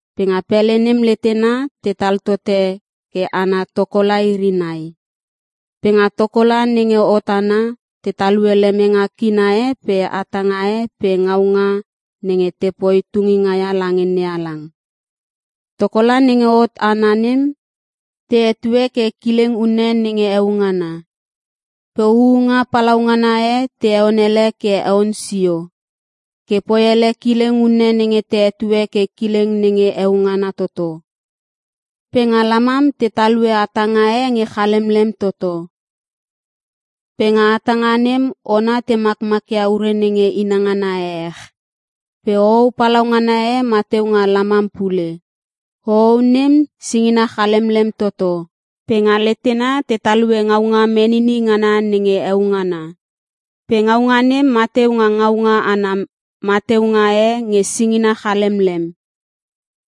Pe nga pele nem letena tetal tote ke ana tokola iri nai. Pe nga tokola nenge hot ana, te talue lemenge kina e pe hatanga e pe ngaunga nenge te poi tunginga ia lange NeHalang. Tokola nenge hot ana nem, te hetue ke Kileng unne nenge Heo Ngana. Pe huunga palaungana e te heon ele ke heon sio, ke poi ele kileng unne nenge te hetue ke Kileng Nenge Heo Ngana Toto. Pe nga lamam te talue hatanga e nge chalemlem toto. Pe nga hatanga nem ona te makmakia ure nenge inangana ehech. Pe hohou palaungana e mateu nga lamam pule. Hohou nem, singina chalemlem toto. Pe nga letena, te talue ngaunga menini ngana nenge heo ngana. Pe ngaunga nem mateu nga ngaunga ana mateunga e nge singina chalemlem.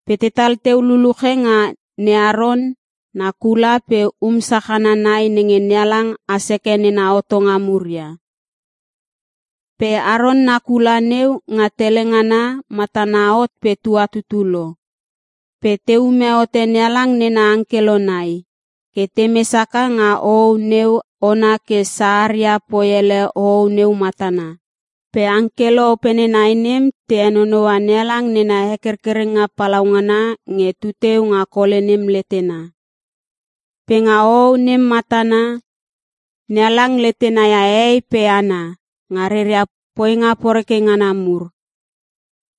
Pe tetal teu luluche nga ne Aron na kula pe um sachana nai nenge NeHalang has heke nena hotonga mur ia. Pe Aron na kula neu, nga tele ngana, matana hot pe tuatutu lo. Pe te ume hote NeHalang nena angkelo nai, ke te mes haka nga hohou neu ona ke saharia poi ele hohou neu matana. Pe angkelo opene nai nem, te henonoua NeHalang nena hekerkerenga palaungana nge tu teu nga Kole nem letena. Pe nga hohou nem matana, NeHalang letena ia hehei pe hana, nga reria poinga poreke ngana mur.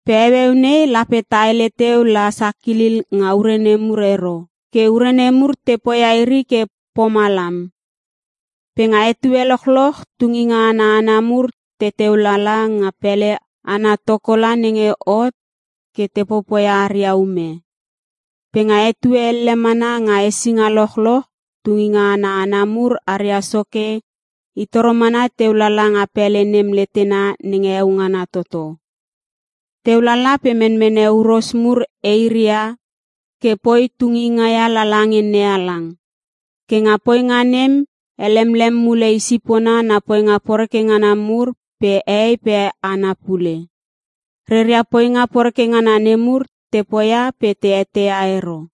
Pe heueu nei lape ta hele teu la sakilil nga ure nemur ero. Ke ure nemur te poia iri ke pomalam. Pe nga etue lochloch tunginga ana hana mur teteu lala nga pele ana tokola nenge hot ke te popoia aria ume. Pe nga etue elle mana nga hesinga lochloch, tunginga ana hana mur aria soke, i toro mana teu lala nga pele nem letena nenge heo ngana toto. Teu lala pe menmene huros mur eiria ke poi tunginga ia lala nge NeHalang. Ke nga poinga nem, helemlem mule i sipona na poinga poreke ngana mur pe hehei pe hana pule. Reria poinga poreke ngana nemur, te poia pe te eteia ero.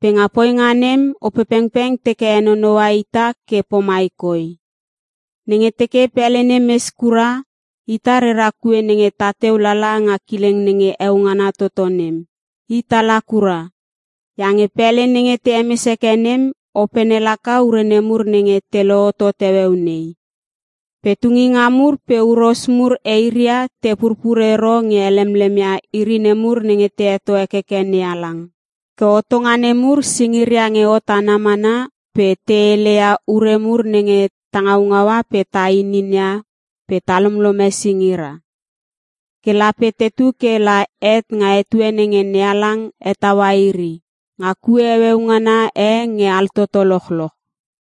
Pe nga poinga nem, Opepengpeng teke henonoua ita ke pomai koi: Nenge teke pele nem mes kura, ita rera kue nenge tateu lala nga kileng nenge heo ngana toto nem, hit ala kura. Iange pele nenge te hemes heke nem, opene laka ure nemur nenge te lohotot heueu nei. Pe tunginga mur pe huros mur eiria te purpur ero nge helemlemia iri nemur nenge te heto hekeke NeHalang. Ke hotonga nemur, singira nge hot ana mana pe te heleia ure mur nenge ta ngaungaua pe ta inin ia pe ta lomlome singira. Ke lape tetu ke la het nga etue nenge NeHalang hetaua iri, nga kue heueu ngana e nge altoto lochloch.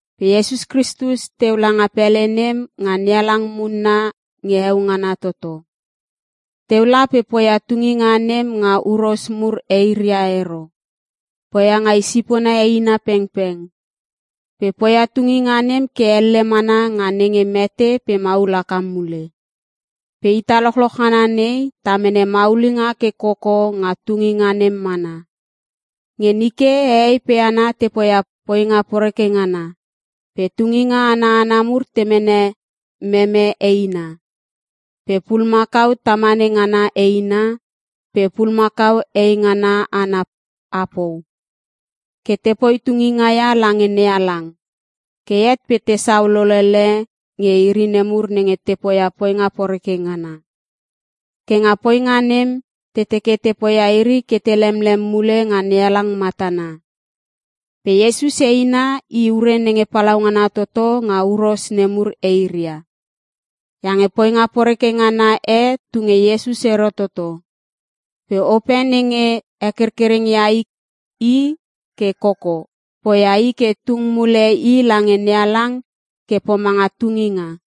Pe Iesus Kristus teu langa pele nem nga NeHalang munna nge heo ngana toto. Teu la pe poia tunginga nem nga huros mur eiria ero. Poia nga i sipona eina pengpeng. Pe poia tunginga nem ke elle mana nga nenge mete pe maul haka mule. Pe ita lochloch ngana nei, ta mene maulinga ke koko nga tunginga nem mana. Nge nike, hehei pe hana te poia poinga poreke ngana, pe tunginga ana hana mur te mene meme eina, pe pulumakau tamane ngana eina, pe pulumakau hei ngana ana apou, ke te poi tunginga ia lange NeHalang. Ke het pe tesau lolele nge iri nemur nenge te poia poinga poreke ngana. Ke nga poinga nem, te teke te poia iri ke te lemlem mule nga NeHalang matana. Pe Iesus eina, i ure nenge palaungana toto nga huros nemur eiria. Iange poinga poreke ngana e tu nge Iesus ero toto. Pe Ope nenge hekerkereng ia i ke koko, poia i ke tung mule i lange NeHalang ke pomanga tunginga.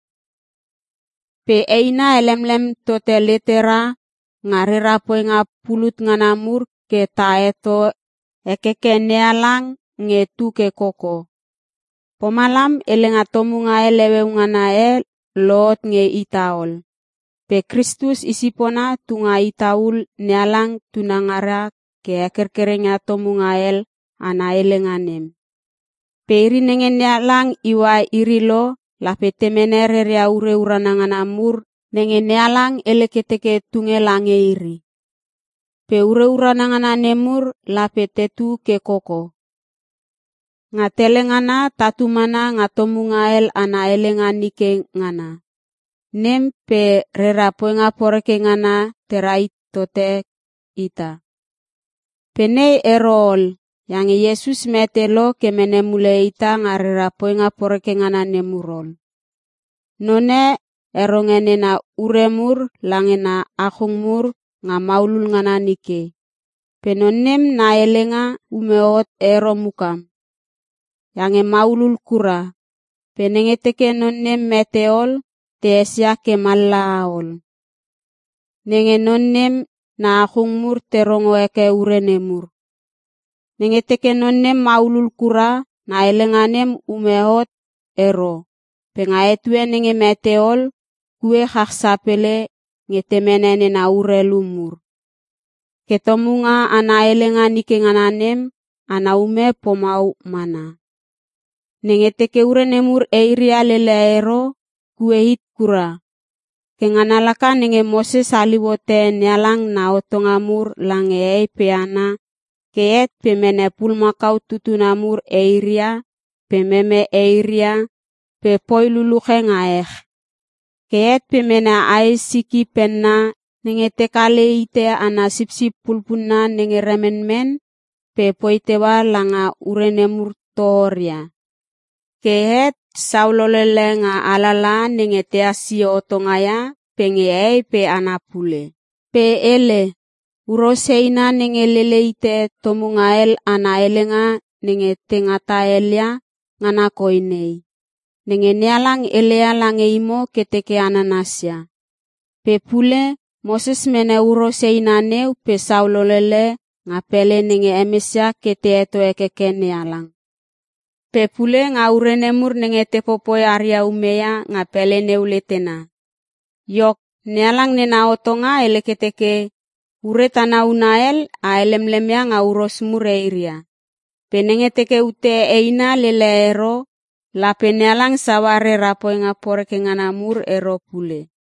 Pe eina helemlem tote letera nga rera poinga pulut ngana mur ke ta heto hekeke NeHalang nge tu ke koko. Pomalam, helenga tomunga hel heueu ngana e lohot nge ita ol. Pe Kristus I sipona tu nga ita ul NeHalang tunangara ke hekerkereng ia tomunga hel ana helenga nem. Pe iri nenge NeHalang iua iri lo, lape te mene reria ure urana ngana mur nenge NeHalang hele ke teke tunge lange iri. Pe ure urana ngana nemur lape tetu ke koko. Nga tele ngana tatu mana nga tomunga hel ana helenga nike ngana nem pe rera poinga poreke ngana te rahit tote ita. Pe nei ero ol iange Iesus mete lo ke mene mule ita nga rera poinga poreke ngana nemur ol. Non e, heronge nena ure mur lange na achung mur nga maulul ngana nike. Pe non nem na helenga ume hot ero mukam, iange maulul kura. Pe nenge teke non nem mete ol, te esia ke mallaha ol. Nenge non nem na achung mur te rongo heke ure nemur. Nenge teke non nem maulul kura, na helenga nem ume hot ero pe nga etue nenge mete ol, kue chach sapele nge te mene nena urelu mur. Ke tomunga ana helenga nike ngana nem, ana ume pomau mana. Nenge teke ure nemur eiria lele ero, kue hit kura. Ke ngana laka nenge Moses haliu hote NeHalang na hotonga mur lange hehei pe hana ke het pe mene pulumakau tutuna mur eiria, pe meme eiria, pe poi luluche nga ech. Ke het pe mene ae siki penna nenge te kale hite ana sipsip pulpunna nenge remenmen pe poi teua langa ure nemur tohoria. Ke het sau lolele nga alalaha nenge tehas sio hotonga ia pe nge hehei pe hana pule. Pe hele, “Huros eina nenge lele hite tomunga hel ana helenga nenge ta ngata helia, ngana koi nei. Nenge NeHalang heleia lange imo ke teke a nanasia.” Pe pule, Moses mene huros eina neu pe sau lolele nga pele nenge hemesia ke te heto hekeke NeHalang. Pe pule nga ure nemur nenge te popoi aria ume ia nga pele neu letena. Iok, NeHalang nena hotonga hele ke teke: Ure tana huna hel, a helemlem ia nga huros mur eiria. Pe nenge teke ute eina lele ero, lape NeHalang saua rera poinga poreke ngana mur ero pule.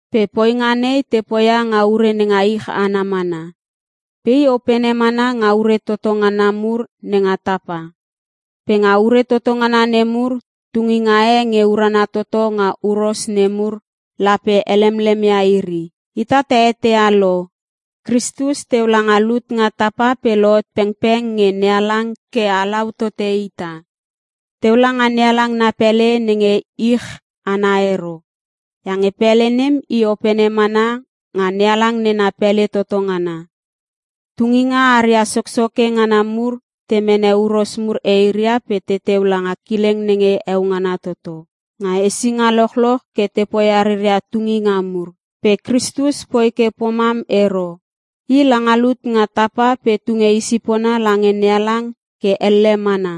Pe poinga nei, te poia nga ure nenga ich ana mana. Pe i opene mana nga ure toto ngana mur nenga tapa. Pe nga ure toto ngana nemur, tunginga e nge urana toto nga huros nemur lape helemlem ia iri. Ita ta eteia lo, Kristus teu langa lut nga tapa pe lohot pengpeng nge NeHalang ke halau tote ita. Teu langa NeHalang na pele nenge ich ana ero. Iange pele nem, i opene mana nga NeHalang nena pele toto ngana. Tunginga aria soksoke ngana mur te mene huros mur eiria pe teteu langa Kileng nenge Heo Ngana Toto nga hesinga lochloch ke te poia reria tunginga mur. Pe Kristus poi ke pomam ero. I langa lut nga tapa pe tunge i sipona lange NeHalang ke elle mana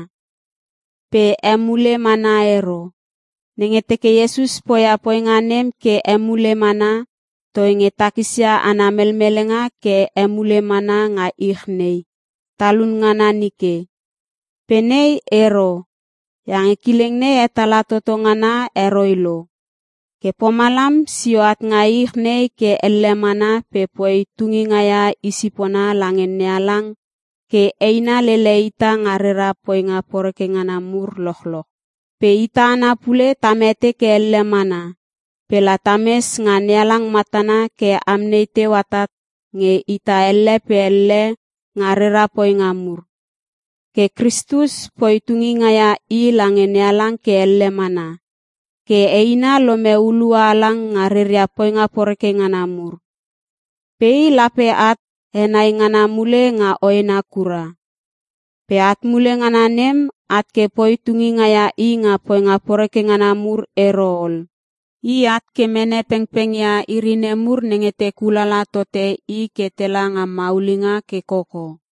pe emule mana ero. Nenge teke Iesus poia poinga nem ke emule mana, toinge takisia ana melmelenga ke emule mana nga ich nei talun ngana nike. Pe nei ero, iange kileng nei hetala toto ngana heroi lo. Ke pomalam sio at nga ich nei ke elle mana pe poi tunginga ia i sipona lange NeHalang ke eina lele ita nga rera poinga poreke ngana mur lochloch. Pe ita hana pule ta mete ke elle mana pe la tames nga NeHalang matana ke amnei teu atat nge ita elle pe elle nga rera poinga mur. Ke Kristus poi tunginga ia I lange NeHalang ke elle mana, ke eina lome hulua halang nga reria poinga poreke ngana mur. Pe I lape at henai ngana mule nga hoena kura. Pe at mule ngana nem, at ke poi tunginga ia I nga poinga poreke ngana mur ero ol. I at ke mene pengpeng ia iri nemur nenge te kulala tote I ke tela nga maulinga ke koko.